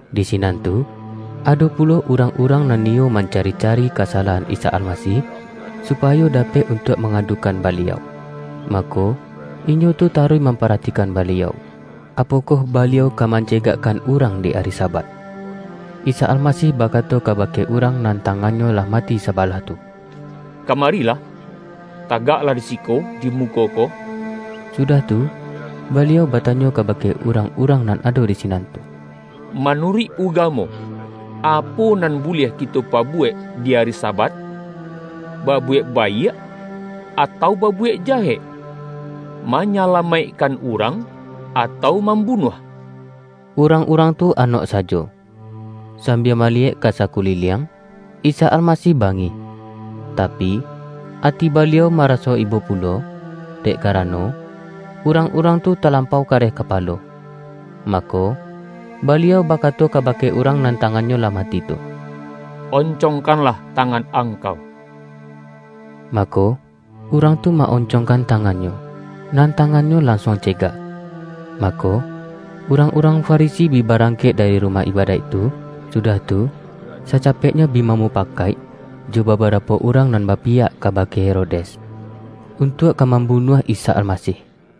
Di sinan tu, ado pulo urang-urang nan niyo mancari-cari kasa-lahan Isa Almasih, supayo dapek un-tuak mangadukan Baliau. Mako, inyo tu taruih mamparatikan Baliau, apo-koh Baliau ka mancegakkan urang di ari Sabat. Isa Almasih bakato kabake urang nan tangannyo lah mati saba-lah tu,”Kamarilah, tagaklah di siko, di muko ko.” Sudah tu, Baliau bata-nyo kabake urang-urang nan ado di sinan tu,”Manuruik ugamo, apo nan buliah kito pabuwek di ari Sabat? Ba-buwek baiak, atau babuwek jahek? Manyalamaikkan urang, atau mam-bunuah?” Urang-urang tu anok sajo. Sambia maliyek ka sakuliliang, Isa Almasih bangih, tapi, ati Baliau maraso ibo pulo, dek karano, urang-urang tu ta-lampau kareh kapalo. Mako, Baliau bakato kabake urang nan tangannyo lah mati tu,”Oncongkanlah tangan angkau,” mako, urang tu ma-oncong-kan tangannyo, nan tangannyo lan-suang cegak. Mako, urang-urang Fa-risi bi barangkek dari rumah ibadaik tu, sudah tu, sacapeknyo bi bamupa-kaik, jo babarapo urang nan bapiyak kabake Herodes, untuak ka mambu-nuah Isa Almasih.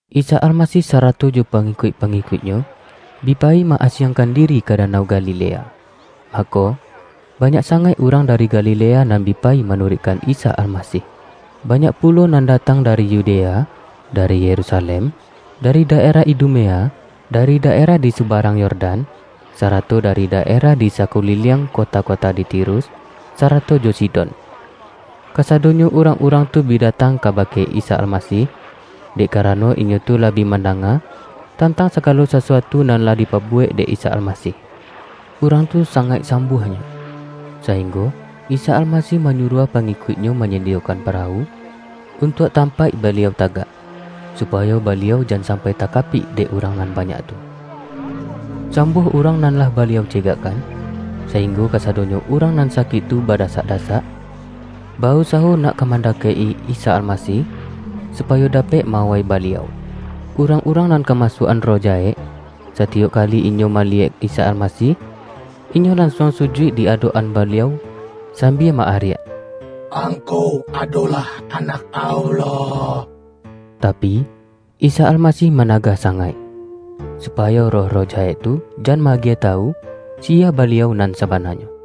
Isa Almasih sarato jo pangikuik-pangikuik-Nyo, bi payi ma-asiangkan diri ka Danau Galilea. Mako, banyak sangaik urang dari Galilea nan bi pa-yi manuruikkan Isa Almasih. Banyak pulo nan datang dari Yudea, dari Yerusalem, dari daerah Idumea, da-ri daerah di subarang Yordan, sarato dari daerah di sakuliliang kota-kota di Tirus, sarato jo Sidon. Kasadonyo urang-urang tu bi datang kabake Isa Almasih, dek karano inyo tu lah bi mandanga, tantang sagalo sasuatu nan lah dipabuwek dek Isa Almasih. Urang tu sangaik sambuahnyo, sa-inggo Isa Almasih manyuruah pangi-kuik-Nyo manyadiyokan parawu, un-tuak tampaik Baliau tagak, supayo Baliau jan sampai takapik dek urang nan banyak tu. Sambuah urang nan lah Baliau cegakkan, sainggo kasa-donyo urang nan sakik tu badasak-dasak, ba-usawo nak ka mandakek-i Isa Almasih, supayo dapek ma-awai Baliau. Urang-urang nan kamasuak-an roh jahek, satiyok kali inyo mali-yek Isa Almasih, inyo lansuang sujuik di adok-an Baliau sambia ma-ariak,”Angkau adolah Anak Allah!” Tapi, Isa Almasih managah sa-ngaik, supayo roh-roh jahek tu jan ma-agiah tawu, siya Baliau nan sa-bananyo.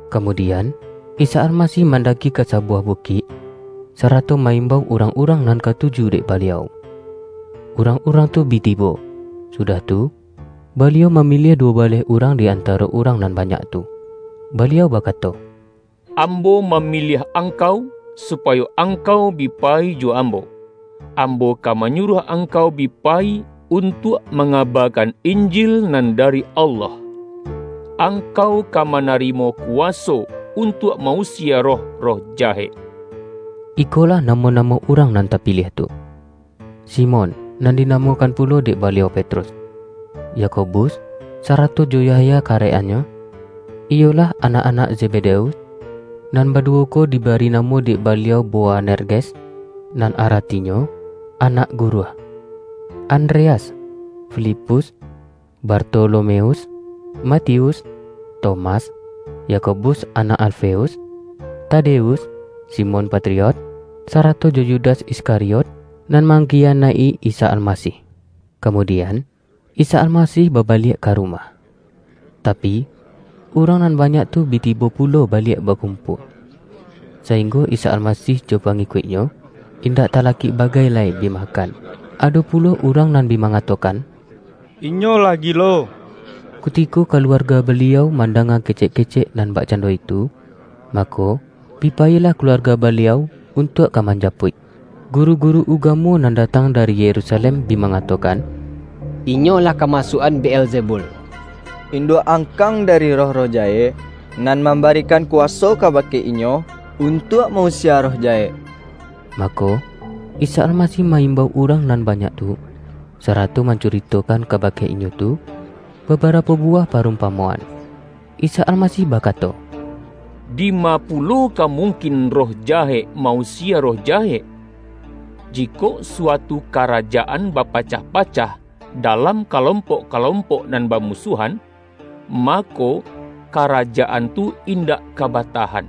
Kamudian, Isa Almasih man-daki ka sabuwah bukik, sarato ma-imbau urang-urang nan katuju dek Baliau. Urang-urang tu bi tibo, su-dah tu, Baliau mamiliah duwo baleh urang di antaro urang nan banyak tu. Baliau bakato,”Ambo mamiliah ang-kau, supayo angkau bi payi jo Ambo, Ambo ka manyuruah angkau bi pa-yi untuak mangabakan Injil nan dari Allah, angkau ka manarimo kuwaso untuak ma-usie roh-roh jahek.” Ikolah namo-namo urang nan tapiliah tu: Simon, (nan dinamokan pulo dek Baliau Petrus), Yakobus, sarato jo Yahya karek-annyo, iyo-lah, anak-anak Zebedeus (nan ba-duwo ko dibari namo dek Baliau Boanerges, nan aratinyo”anak gu-ruah"), Andreas, Filipus, Barto-lomeus, Matius, Tomas, Yakobus anak Alfeus, Tadeus, Simon Patriot, sarato jo Yudas Iskariot, nan mang-kiyanaik-i Isa Almasih. Kamudian, Isa Almasih babaliak ka rumah. Tapi, urang nan banyak tu bi tibo pulo baliak bakumpua, saing-go Isa Almasih jo pangikuik-Nyo, in-dak talakik bagai lai bi makan. Ado pulo urang nan bi mangatokan,”Inyo lah gilo!” Kutiko kaluarga Baliau man-danga kecek-kecek nan bakcando itu, mako, bi payilah kaluarga Baliau, un-tuak ka manjapuik. Guru-guru ugamo nan datang dari Yerusalem bi mangatokan,”Inyo lah kamasuak-an Beelzebul! Induak-ang-kang dari roh-roh jahek, nan mam-barikan kuwaso kabake Inyo, untuak ma-usie roh jahek.” Mako, Isa Almasih ma-imbau urang nan banyak tu, sarato mancu-ritokan kabake inyo tu, babarapo bu-wah parumpamoan. Isa Almasih baka-to,”Dima pulo ka mungkin, roh jahek ma-usie roh jahek.” ”Jikok suatu ka-rajaan bapacah-pacah, dalam kalom-pok-kalompok nan bamusuahan, mako, karajaan tu indak ka batahan.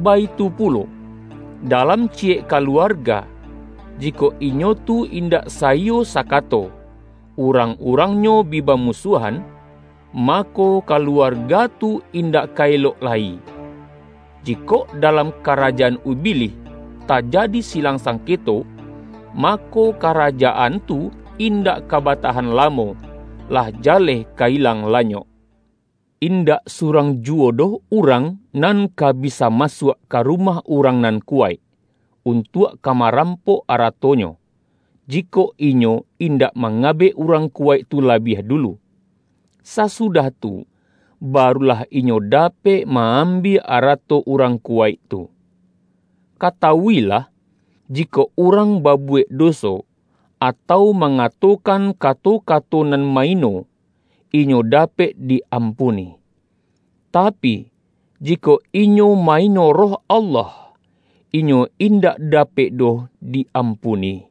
Baitu pulo dalam ciyek kaluarga, jikok inyo tu indak saiyo sakato, urang-urangnyo bi bamusuahan, mako, kaluarga tu indak ka elok lai. Jikok dalam ka-rajaan Ubilih tajadi silang sangketo, mako, karajaan tu indak ka batahan lamo, lah jaleh ka ilang lanyok. Indak surang juwo doh urang nan ka bisa masuak, ka rumah urang nan kuwaik, untuak ka marampok arato-nyo, jikok inyo indak mangabek urang kuwaik tu labiah dulu. Sasudah tu, barulah inyo dapek ma-ambiak ara-to urang kuwaik tu. Katawuilah! Jikok urang babuwek doso, atau mangatokan kato-kato nan ma-ino, inyo dapek di-ampuni. Tapi, jikok inyo ma-ino Roh Allah, inyo in-dak dapek doh di-ampuni!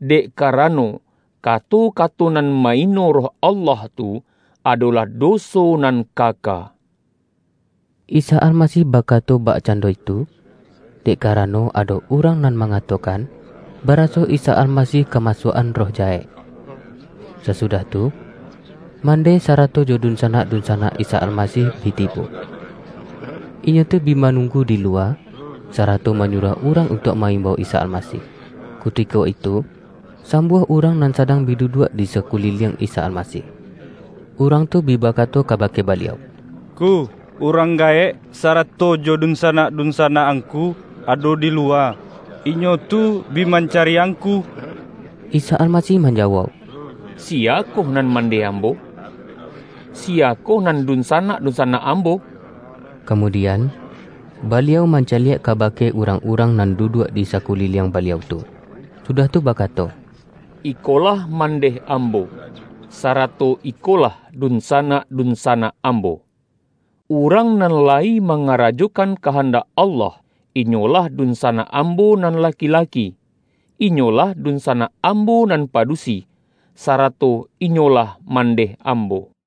Dek kara-no kato-kato nan ma-ino Roh Allah tu, adolah doso nan kaka.” ( IsaAlmasih bakato bakcando itu, dek karano ado urang nan mangatokan, baraso Isa Al-masih kamasuak-an roh jahek.) Sasudah tu, mandeh sarato jo dun-sanak-dunsanak Isa Almasih bi tibo. Inyo tu bi manunggu di luwa, sara-to manyuruah urang untuak ma-im-bau Isa Almasih. Kutiko itu, sam-buah urang nan sadang bi duduak di sakuliliang Isa Almasih. Urang tu bi bakato kabake Baliau,”Ngku, urang gaek, sarato jo dunsanak-dunsanak Angku ado di luwa. Inyo tu bi man-cari Angku.” Isa Almasih manjawauk,”Siya-koh nan mandeh Ambo? Siyakoh nan dunsanak-dunsanak Ambo?” Kamu-dian, Baliau mancaliak kabake urang-urang nan duduak di sakuliliang Baliau tu, sudah tu bakato,”Ikolah mandeh Ambo, sarato ikolah dunsanak-dun-sanak Ambo! Urang nan layi ma-ngarajokan kahandak Allah, inyolah dunsanak Ambo nan laki-laki, inyo-lah dunsanak Ambo nan padusi, sa-rato inyolah mandeh Ambo.”